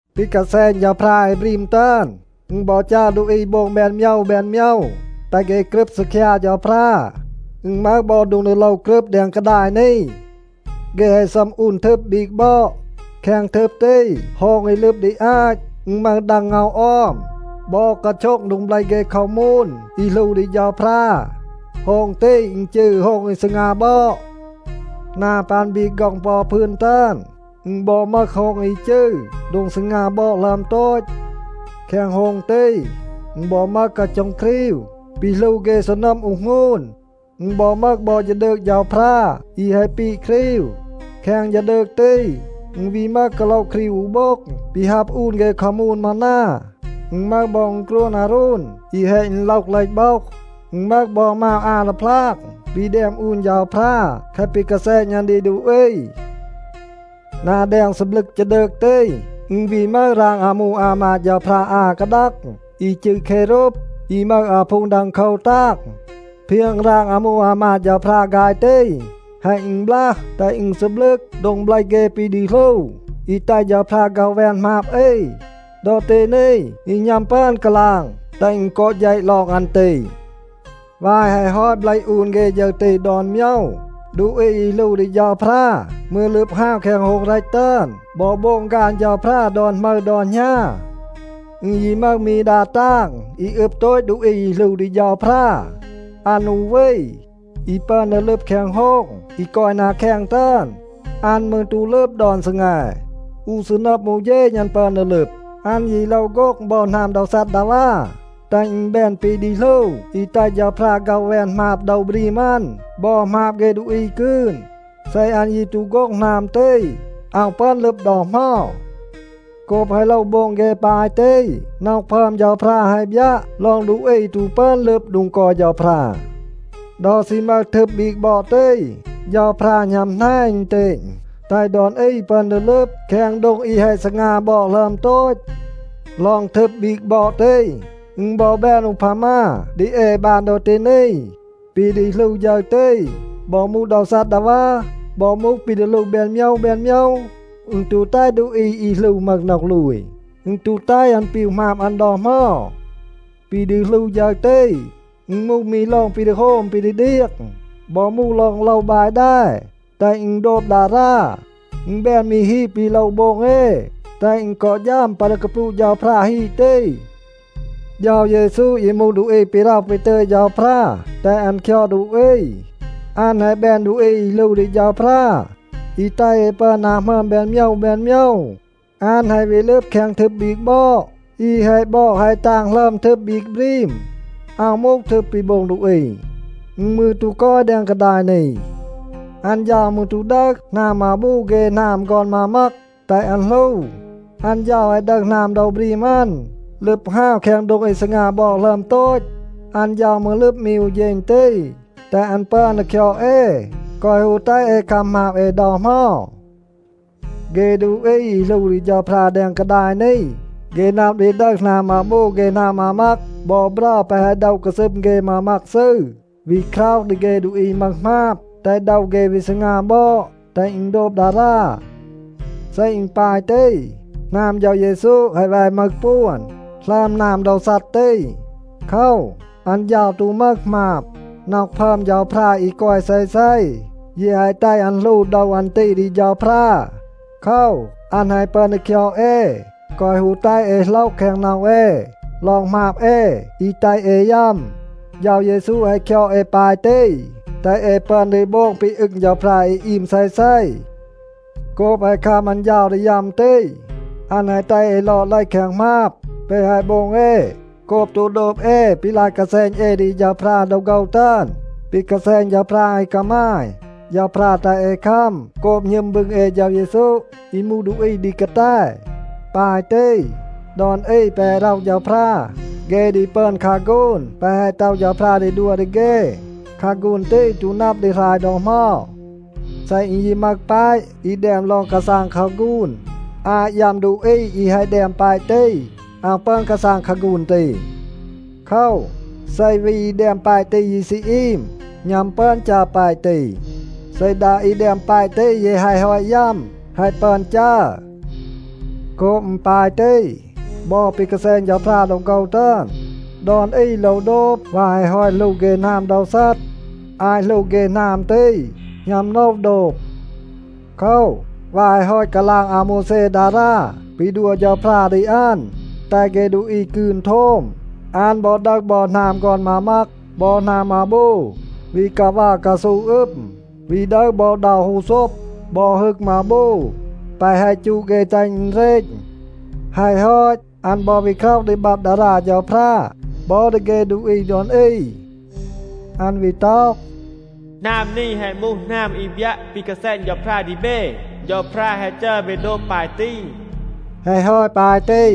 ปี กาแซณ เฌาพรา อี บรีม ตึอน, อึณ บอ จัร ดูอี โบง แบน โมยว แบน โมยว, แตห เฆ กรึบ ซีคยา เฌาพรา. อึณ มึห บอ โดง ดี โลว กรึบ แดง กาดาย นี. เฆ แฮะ ซัม อูน ทึบ บีก บอด. แคง ทึบ ตี โฮง อี ลึบ ดี อาต, อึณ มึห ดัง เงา ออม, บอ กาโช็ง โดง เบลห เฆ คามูน อี หลู ดี เฌาพรา. โฮง ตี อึณ จืร โฮง อี ซีงา บอด. นา ปัน บีก ฆ็อง ปอ อู พืน ตึอน, อึณ บอ มึห โฮง อี จืร โดง ซีงา บอด หลึอม โตต. แคง โฮง ตี, อึณ บอ มึห กาโช็ง ครีว ปี หลู เฆ ซีนัม อูห หงูน. อึณ บอ มึห บอ ฌีดืก เฌาพรา อี แฮะ ปีด ครีว. แคง ฌีดืก ตี, อึณ วี มึห กาโละ ครีว อู โบ็ง ปี ฮับ อูน เฆ คามูน มานา. อึณ มึห บอ อึณกรวน อาโรน อี แฮะ อึณโลห เลห โบห. อึณ มึห บอ มาว อา ดีพลาง ปี แดม อูน เฌาพรา แคะ ปี กาแซณ อัน ดี ดูอี. นา แดง ซีบลึก ฌีดืก ตี, อึณ วี มึห ราง อามู อามาด เฌาพรา อา กาดัง อี จืร เครูบa อี มึห อาพูง ดังโคว ตาง. เพียง ราง อามู อามาด เฌาพรา ฆาย ตี แฮะ อึณบลัห, แตห อึณ ซีบลึก โดง เบลห เฆ ปี ดี หลู อี แตห เฌาพรา ฆ็อห แวน หมาบ อี. ดอ ตี นี, ยี หณัม ปึอน กาลาง แตห อึณ กอ เฌะ ลอง อัน ตี. วาย แฮะ ฮอต เบลห อูน เฆ ฌึร ตี ดอน โมยว, ดูอี อี หลู ดี เฌาพรา มืร ลึบ ฮาว แคง โฮง เรต ตึอน บอ โบง ฆาน เฌาพรา ดอน หมึร ดอน หณา. อึณ ยี มึห มี ดา ตาง อี อึบ โตต ดูอี อี หลู ดี เฌาพรา. อัน อู วี, อี ปึอน ดี ลึบ แคง โฮง อี กอย นา แคง ตึอน. อัน มืร ตู ลึบ ดอน ซีแง. อู ซีนัม อู เฌณ อัน ปึอน ดี ลึบ. อัน ยี โลว โฆ็ง บอ หนาม โดว ซัดดาวา, แตห อึณ แบน ปี ดี หลู อี แตห เฌาพรา ฆ็อห แวน หมาบ โดว บรีม อัน บอ หมาบ เฆ ดูอี กืน. เซ อัน ยี ตู โฆ็ง หนาม ตี, อาว ปึอน ลึบ ดอ เหมา. โกบ แฮะ โลว โบง เฆ ปาย ตี, น็อห พึอม เฌาพรา แฮะ บยัะ ลอง ดูอี ตู ปึอน ลึบ โดง กอย เฌาพรา. ดอ ซี มึห ทึบ บีก บอด ตี, เฌาพรา หณัม แหน อึณเตณ, แตห ดอน อี ปึอน ดี ลึบ แคง โดง อี แฮะ ซีงา บอด หลึอม โตต. ลอง ทึบ บีก บอด ตี, อึณ บอ แบน อูพามา ดี เอ บาน ดอ ตี นี. ปี ดี หลู ฌึร ตี, บอ มูห โดว ซัดดาวา, บอ มูห ปี ดี หลู แบน โมยว แบน โมยว, อึณ ตู แตห ดูอี อี หลู มึห น็อห ลูย. อึณ ตู แตห อัน ปีว หมาบ อัน ดอ เหมา. ปี ดี หลู ฌึร ตี, อึณ มูห มี ลอง ปี ดี โฮม ปี ดี เดียง บอ มูห ลอง โลว บาย แด, แตห อึณ โดบ ดารา. อึณ แบน มี ฮีด ปี โลว โบง เอ, แตห อึณ กอ ฌัม ปัน ดี กาปลูะ เฌาพรา ฮีด ตี. เฌา เยซู ยี มูห ดูอี ปี ร็อห ปี ตึย เฌาพรา แตห อัน คยอด ดูอี. อัน แฮะ แบน ดูอี อี หลู ดี เฌาพรา อี แตห เอ ปึอน นา หมึอม แบน โมยว แบน โมยว. อัน แฮะ วี ลึบ แคง ทึบ บีก บอด อี แฮะ บอด แฮะ ตาง หลึอม ทึบ บีก บรีม. อาว มูห ทึบ ปี โบง ดูอี. อึณ มืร ตู กอย แดง กาดาย นี. อัน เฌา มืร ตู ดึห หนาม มาบู เฆ หนาม ฆอน มามัก, แตห อัน หลู. อัน เฌา แฮะ ดึห หนาม โดว บรีม อัน, ลึบ ฮาว แคง โดง อี ซีงา บอด หลึอม โตต. อัน เฌา มืร ลึบ มี อู เฌณ ตี, แตห อัน ปึอน ดี คยอด เอ, แกวะ ฮู แตห เอ คัม หมาบ เอ ดอ เหมา. เฆ ดูอี อี หลู ดี เฌาพรา แดง กาดาย นี, เฆ นับ ดี ดึห หนาม มาบู เฆ หนาม มามัก บอ เบรา แปะ แฮะ โดะ กาซึม เฆ มามัก ซืร, วี คร็อห ดี เฆ ดูอี มึห หมาบ, แตห โดว เฆ วี ซีงา บอด, แตห อึณ โดบ ดารา. เซ อึณ ปาย ตี, หนาม เฌา เยซู แฮะ แว มึห ปวน หลึอม หนาม โดว ซัด ตี. โคว, อัน เฌา ตู มึห หมาบ. น็อห พึอม เฌาพรา อี กอย เซเซ ยี แฮะ แตห อัน หลู โดว อัน ตี ดี เฌาพรา. โคว, อัน แฮะ ปึอน ดี คยอด เอ, แกวะ ฮู แตห เอ โหลห แคง น็อห เอ ลอง หมาบ เอ อี แตห เอ ยัม. เฌา เยซู แฮะ คยอด เอ ปาย ตี, แตห เอ ปึอน ดี โบง ปี อึง เฌาพรา อี อีม เซเซ. โกบ แฮะ คัม อัน เฌา ดี ยัม ตี, อัน แฮะ แตห เอ ลอด เลห แคง หมาบ แปะ แฮะ โบง เอ โกบ ตู โดบ เอ ปี ลาย กาแซณ เอ ดี เฌาพรา ดอ โฆว ตึอน. ปี กาแซณ เฌาพรา อี กามาย, เฌาพรา แตห เอ คัม โกบ หณึม บึง เอ เฌา เยซู อี มูห ดูอี ดี กาแต. ปาย ตี, ดอน อี แปะ แฮะ ร็อห เฌาพรา, เฆ ดี ปึอน คาฆูน แปะ แฮะ ต็อห เฌาพรา ดี ดัว ดี เฆ. คาฆูน ตี ตู นับ ดี หราย ดอ เหมา. เซ อึณ ยี มึห แปะ อี แดม ลอง กาซาง คาฆูน, อาต ยัม ดูอี อี แฮะ แดม แปะ ตี, อาว ปึอน กาซาง คาฆูน ตี. โคว, เซ วี อี แดม แปะ ตี ยี ซี อีม, หณัม ปึอน จัร แปะ ตี. เซ ดา อี แดม แปะ ตี ยี แฮะ ฮอต ยัม, แฮะ ปึอน จัร. โกบ อึณ ปาย ตี, บอ ปี กาแซณ เฌาพรา ดอ โฆว ตึอน, ดอน อี โลว โดบ วาย แฮะ ฮอต หลู เฆ หนาม โดว ซัด. อาต หลู เฆ หนาม ตี, หณัม โลว โดบ. โคว, วาย แฮะ ฮอต กาลาง อาโมวแซ ดารา ปี ดัว เฌาพรา ดี อัน, แตห เฆ ดูอี กืน โทม, อัน บอ ดึห บอ หนาม ฆอน มามัก บอ หนาม มาบู วี กาวัร กาซู อึม, วี ดึห บอ เดา ฮูโซบ, บอ ฮึก มาบู แปะ แฮะ จูด เฆ แตห อึณ เรณ. แฮะ ฮอต, อัน บอ วี คร็อห ดี บับ ดารา เฌาพรา บอ ดี เฆ ดูอี ดอน อี. อัน วี ต็อห, “หนาม นี แฮะ มูห หนาม อี บยัะ ปี กาแซณ เฌาพรา ดี เบ. เฌาพรา แฮะ จัร เบ โดบ ปาย ตี.” แฮะ ฮอต ปาย ตี,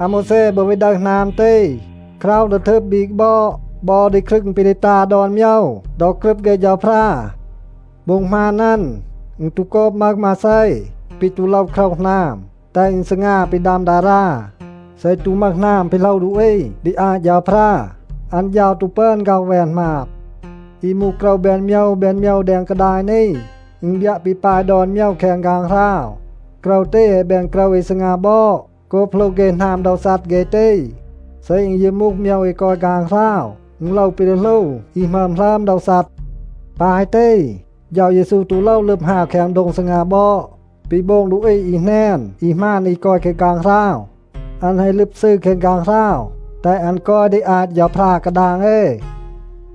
อาโมวแซ บอ วี ดึห หนาม ตี, คร็อห ดี ทึบ บีก บอด บอ ดี ครึง ปี ดี ตา ดอน โมยว ดอ กรึบ เฆ เฌาพรา. โบ็ง หมาน อัน, อึณ ตู โกบ มึห มาเซ ปี ตู โลว คร็อห หนาม, แตห อึณ ซีงา ปี ดัม ดารา. เซ ตู มึห หนาม ปี โหลว ดูอี ดี อาต เฌาพรา, อัน เฌา ตู ปึอน ฆ็อห แวน หมาบ. อี มูห โกรว แบน โมยว แบน โมยว แดง กาดาย นี, อึณ บยัะ ปี ปาย ดอน โมยว แคง ฆางหราว. โกรว ตี แฮะ แบน โกรว อี ซีงา บอด โกบ หลู เฆ หนาม โดว ซัด เฆ ตี. เซ อึณ ยี มูห โมยว อี กอย ฆางหราว, อึณ โลว ปี ดี หลู อี หมึอม หลึอม โดว ซัด. ปาย ตี, เฌา เยซู ตู โลว ลึบ ฮาว แคง โดง ซีงา บอด ปี โบง ดูอี อี แหนน, อี หมาน อี กอย แคง ฆางหราว. อัน แฮะ ลึบ ซืร แคง ฆางหราว, แตห อัน กอย ดี อาต เฌาพรา กาดาง เอ.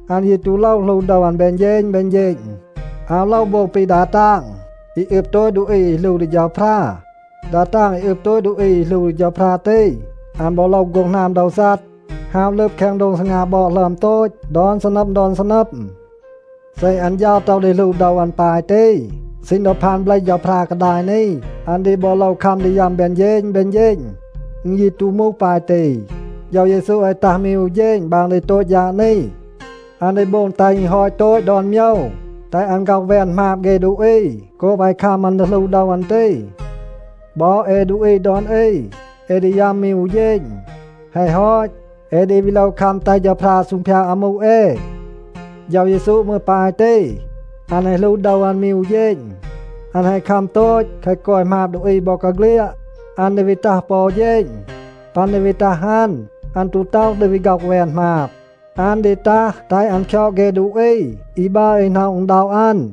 อัน ยี ตู โลว หลู โดว อัน แบน เฌณ แบน เฌณ. อาว โลว โบง ปี ดา ตาง อี อึบ โตต ดูอี อี หลู ดี เฌาพรา. ดา ตาง อี อึบ โตต ดูอี อี หลู ดี เฌาพรา ตี, อัน บอ โลว โฆ็ง หนาม โดว ซัด, ฮาว ลึบ แคง โดง ซีงา บอด หลึอม โตต ดอน ซีนัม ดอน ซีนัม. เซ อัน เฌา ต็อห ดี หลู โดว อัน ปาย ตี, ซีณ ดอ พาน เบลห เฌาพรา กาดาย นี, อัน ดี บอ โลว คัม ดี ยัม แบน เฌณ แบน เฌณ. อึณ ยี ตู มูห ปาย ตี. เฌา เยซู แฮะ ตัห มี อู เฌณ บาง ดี โตต ฌาด นี. อัน ดี โบง แตห อึณ ฮอต โตต ดอน โมยว, แตห อัน ฆ็อห แวน หมาบ เฆ ดูอี โกบ แฮะ คัม อัน ดี หลู โดว อัน ตี. บอ เอ ดูอี ดอน อี, เอ ดี ยัม มี อู เฌณ. แฮะ ฮอต, เอ ดี วี โลว คัม แตห เฌาพรา ซูงพยาด อามู เอ. เฌา เยซู มืร ปาย ตี. อัน แฮะ หลู โดว อัน มี อู เฌณ. อัน แฮะ คัม โตต แคะ กอย หมาบ ดูอี บอกาเฆลียด. อัน ดี วี ตัห ปอ อู เฌณ. ปัน ดี วี ตัห อัน, อัน ตู ต็อห ดี วี ฆ็อห แวน หมาบ. อัน ดี ตัห แตห อัน คยอด เฆ ดูอี อี บัร อี หน็อะ อึณด็อะ อัน.